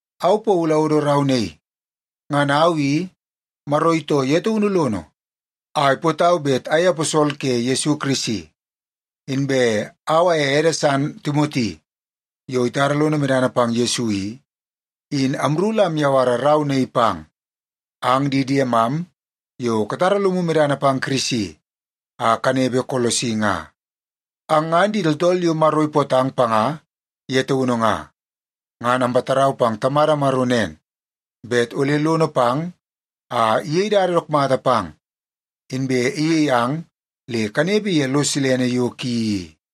Au Paulu awodo rau naii. Ngan au i, Maro itoo ye taunu lono a ipootau bet ayei aposol ke Yesu Kirisi. Inbe au aye ede san Timoti, yo itara lono medana pang Yesu i, in amru la amyawara rau naii pang ang di diemam yo katara lomu medana pang Kirisi a kanepe Kolosi nga. Ang ngan di tooltool yo Maro ipootang panga ye taunu nga. Ngan ampatarau pang Tamada Maro nen, bet ole lono pang a iyei dada dook mata pang, inbe iyei ang le kanepe ye lo silene yo ki i.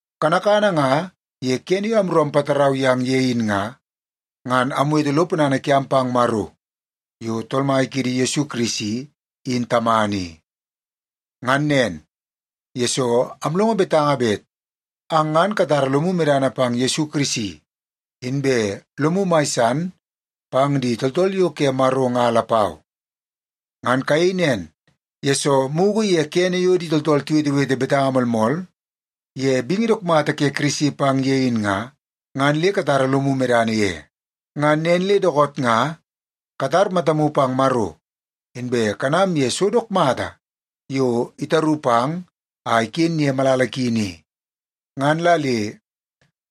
Kanakana nga ye kene yo amru ampatarau yang ye in nga, ngan amwete lo ponana kiam pang Maro yo Tool Mai kiidi Yesu Kirisi in Tamana i. Ngan nen, yesoo amlongo betanga bet ang ngan katara lomu medana pang Yesu Kirisi, inbe lomu mai san pang di tooltool yo ke Maro nga lapau. Ngan kayei nen, yesoo mugu ye kene yo di tooltool tiwetewete betanga moolmool ye bingi dook mata ke Kirisi pang ye in nga, ngan le katara lomu medana ye. Ngan nen le dookoot nga katar matamu pang Maro, inbe kanam ye so dook mata yo itaru pang a iken ye malala ki ni. Ngan la le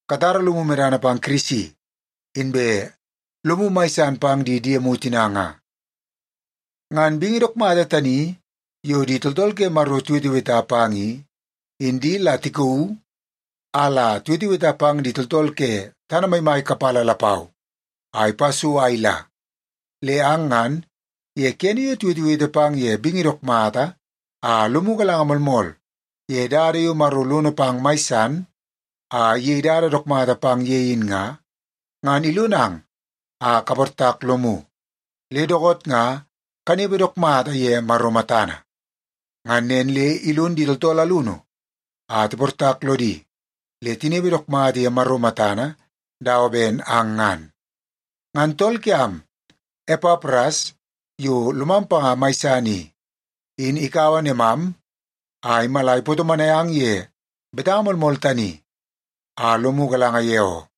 katara lomu medana pang Kirisi, inbe lomu mai san pang di diemu tina nga. Ngan bingi dook mata tani yo di tooltool ke Maro tiweteweta pang i, in di la tikauu a la tiweteweta pang di tooltool ke tana maimai kapala lapau a ipa so a ila. Le ang ngan, ye kene yo tiwetewete pang ye bingi dook mata a lomu galanga moolmool ye dada yo Maro lono pang mai san a iyei dada dook mata pang ye in nga, ngan ilonang a kaportak lomu, le dookoot nga kanepe dook mata ye Maro matana. Ngan nen le ilon di tooltool alunu a tiportak lodi le tinepe dook mata ye Maro matana dawa ben ang ngan. Ngan tool kiam, Epapras, yo lomam panga mai san i, in ikaua nemam a imala ipatomonai ang ye betanga moolmool tani a lomu galanga ye oo.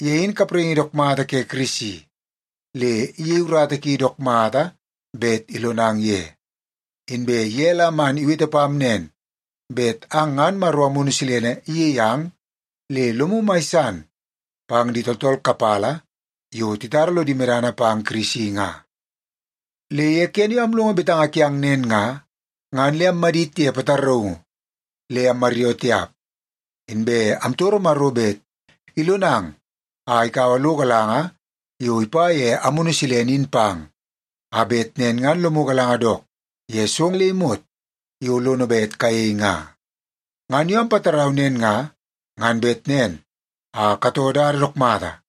Ye in kapraingi dook mata ke Kirisi le iyei urata ki dook mata bet ilonang ye. Inbe ye la man iwete pam nen, bet ang ngan Maro Amunu Silene iyei ang le lomu mai san pang di tooltool kapala yo titara lodi medana pang Kirisi nga. Le ye kene yo amlongo betanga kiang nen nga, ngan le ammadit ye pataraungu le ammaryoo tiap. Inbe amtoro Maro bet ilonang a ikaua lo galanga yo ipa ye Amunu Silene in pang, a bet nen ngan lomu galanga dook ye so le imot yo lono bet kayei nga. Ngan yo ampatarau nen nga, ngan bet nen a katoo dada dook mata,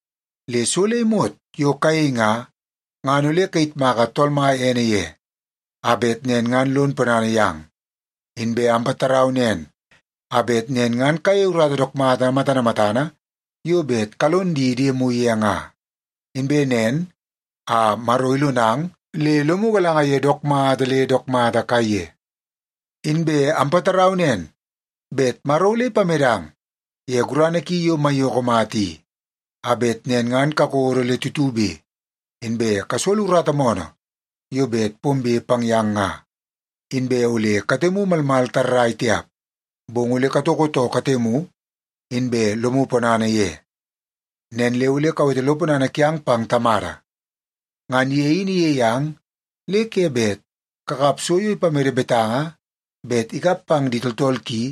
le so le imot yo kayei nga, ngan ole kayitmaka Tool Mai ene ye, a bet nen ngan lon ponana yang. Inbe ampatarau nen a bet nen ngan kayei urata dook mata matana matana yo bet kalon di diemu ye nga. Inbe nen a Maro ilonang le lomu galanga ye dook mata le dook mata kaiye. Inbe ampatarau nen, bet Maro ole ipamedang ye gurana ki yo maiyoko mata i, a bet nen ngan kakodo le tutube, inbe kasolo urata moonoo yo bet pombe pang yang nga, inbe ole katemu malmal tarrai tiap, bong ole katoko too katemu, inbe lomu ponana ye. Nen le ole kawete lo ponana kiang pang Tamada. Ngan ye in iyei ang le ke bet kakap so yo ipamede betanga bet ikap pang di tooltool ki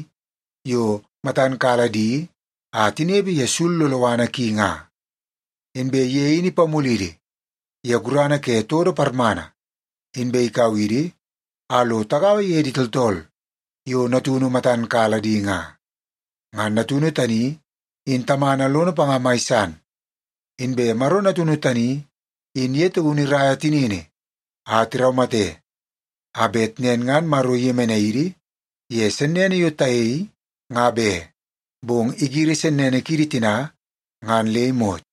yo matan kala di a tinepe ye sul loloana ki nga. Inbe ye in ipamulidi ye gurana ke todo parmana, inbe ikau idi a lo tagaua ye di tooltool yo Natunu matan kala di nga. Ngan Natunu tani in Tamana lono panga mai san. Inbe Maro Natunu tani in ye taunu iraia tinini a tiraumate, a bet nen ngan Maro iyemenai idi ye sennene yo tayei nga be, bong igiri sennene kiidi tina ngan le imot.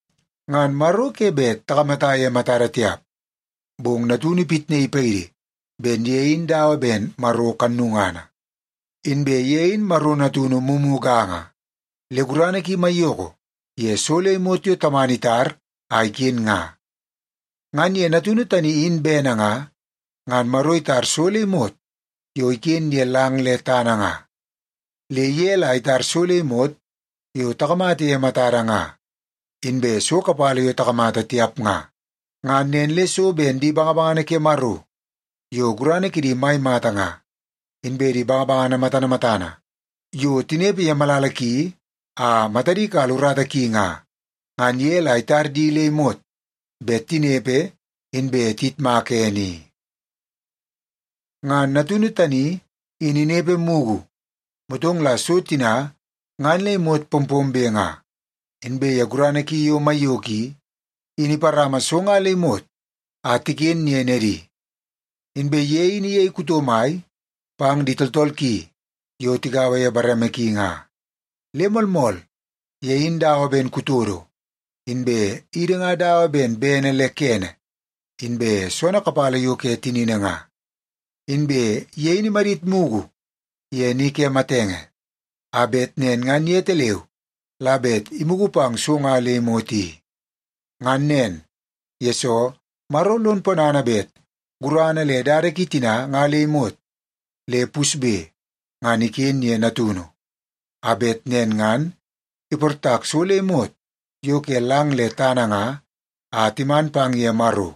Ngan Maro ke bet takamata ye matada tiap, bong Natunu ipitnaii paidi ben ye in dawa ben Maro kannungana. Inbe ye in Maro Natunu mumuganga, le gurana ki maiyoko ye so le imot yo Tamana itar a iken nga. Ngan ye Natunu tani in bene nga, ngan Maro itar so le imot yo iken ye lang le tana nga. Le ye la itar so le imot yo takamata ye matada nga, inbe so kapala yo takamata tiap nga. Ngan nen le so ben di bangabangana ke Maro yo gurana kidi mai mata nga, inbe di bangabangana matana matana yo tinepe ye malala ki a matadi kala urata ki nga, ngan ye la itar di le imot bet tinepe inbe tiyitmaka ene i. Ngan Natunu tani in inepe mugu, motong la so tina ngan le imot pompombe nga. Inbe ye gurana ki yo maiyoko i, in iparama so nga le imot a tiken ye nedi. Inbe ye in iyei kuto mai pang di tooltool ki yo tigaua ye bareme ki nga. Le moolmool, ye in dawa ben kutodo, inbe idi nga dawa ben bene le kene inbe soonoo kapala yo ke tinini nga. Inbe ye in imadit mugu ye ni ke matenge, a bet nen ngan yetaleu la bet imugu pang so nga le imot i. Ngan nen, yesoo Maro lon ponana bet gurana le dada ki tina nga le imot le pusbe, ngan iken ye Natunu, a bet nen ngan iportak so le imot yo ke lang le tana nga a timan pang ye Maro.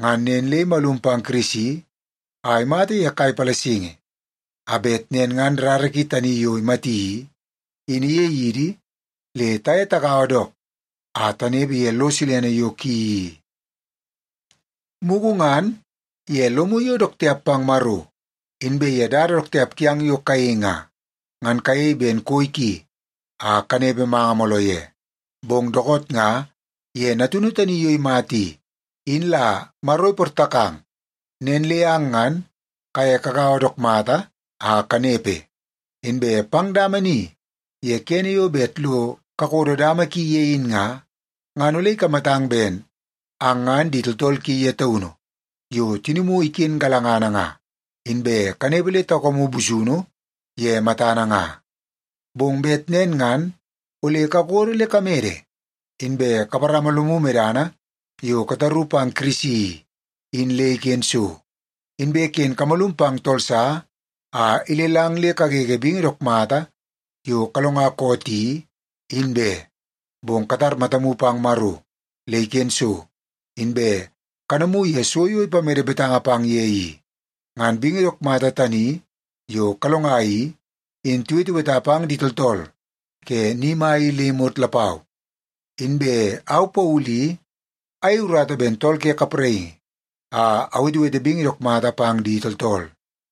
Ngan nen le imalum pang Kirisi a imata ye kai palasingi, a bet nen ngan rara ki tani yo imati i, in iyei idi le taye tagaua dook a tanepe ye lo silene yo ki i. Mugu ngan, ye lomu yo dook tiap pang Maro, inbe ye dada dook tiap kiang yo kayei nga, ngan kayei ben koi ki a kanepe manga mooloo ye. Bong dookoot nga ye Natunu tani yo imata i, in la Maro iportakang, nen le ang ngan kaye kagaua dook mata a kanepe. Inbe pang dama ni ye kene yo bet lo kakodo dama ki ye in nga, ngan ole ikamatang ben ang ngan di tooltool ki ye taunu yo tinimu iken galangana nga, inbe kanepe le taukamu busunu ye matana nga. Bong bet nen ngan ole kakodo le kamede, inbe kaparama lomu medana yo kataru pang Kirisi i, in le iken so. Inbe ken kamalum pang tool sa a ilelang le kagege bingi dook mata yo kalonga koot i, in be, bong katar matamu pang Maro le iken so, inbe kanamu ye so yo ipamede betanga pang ye i. Ngan bingi dook mata tani yo kalonga i, in tiweteweta pang di tooltool ke ni mai i le imot lapau. Inbe au Paulu i, ayei urata ben tool ke kapraingi a awetewete bingi dook mata pang di tooltool.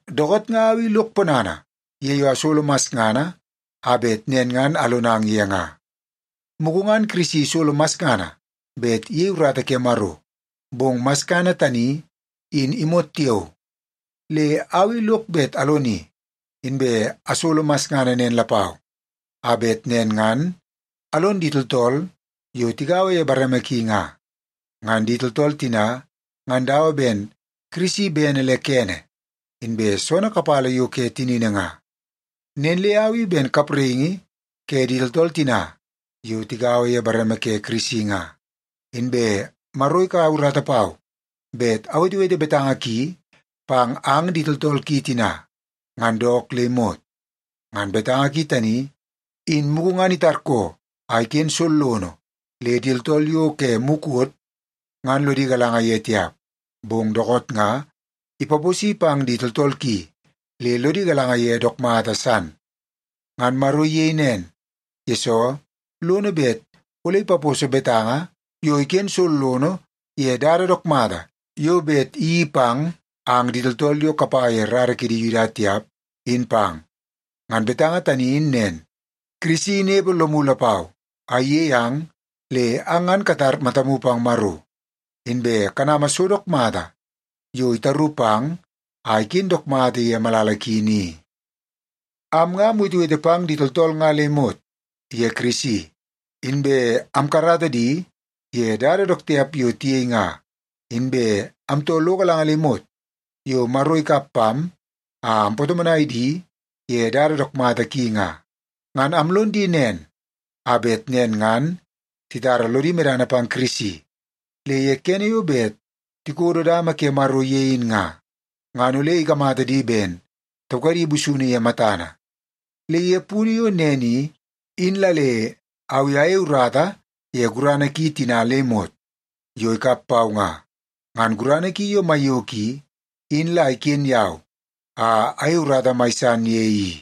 Dookoot nga au i lok ponana ye yo asolo masngana a bet nen ngan alonang ye nga. Mugu ngan Kirisi isolo masngana bet iyei urata ke Maro, bong masngana tani in imot tiao. Le au i lok bet aloni, inbe asolo masngana nen lapau, a bet nen ngan alon di tooltool yo tigaua ye bareme ki nga. Ngan di tooltool tina, ngan dawa ben Kirisi bene le kene inbe soonoo kapala yo ke tinini nga. Nen le au i ben kapraingi ke di tooltool tina yo tigaua ye bareme ke Kirisi nga, inbe Maro ikaua urata pau bet awetewete betanga ki pang ang di tooltool ki tina, ngan dook le imot. Ngan betanga ki tani, in mugu ngan itarkoo a iken sollono le di tooltool yo ke mukot ngan lodi galanga ye tiap, bong dookoot nga ipaposi pang di tooltool ki le lodi galanga ye dook mata san. Ngan Maro iyei nen, yesoo lono bet ole ipaposo betanga yo iken sollono ye dada dook mata yo bet iyeii pang ang di tooltool yo kapa ye rara kidi Yuda tiap, in pang. Ngan betanga tani in nen, Kirisi inepe lomu lapau a iyei ang le ang ngan katar matamu pang Maro, inbe kanama so dook mata yo itaru pang a iken dook mata ye malala ki ni. Am nga amwetewete pang di tooltool nga le imot ye Kirisi, inbe amkarata di ye dada dook tiap yo tiyei nga, inbe amtoo lo galanga le imot yo Maro ikap pam a ampatomonai di ye dada dook mata ki nga. Ngan amlon di nen a bet nen ngan titara lodi medana pang Kirisi, le ye kene yo bet tikodo dama ke Maro ye in nga, ngan ole ikamata di ben taukadi busunu ye matana. Le ye punu yo nen i, in la le au i ayei urata ye gurana ki tina le imot yo ikap pau nga. Ngan gurana ki yo maiyoko i, in la iken yau a ayei urata mai san ye i.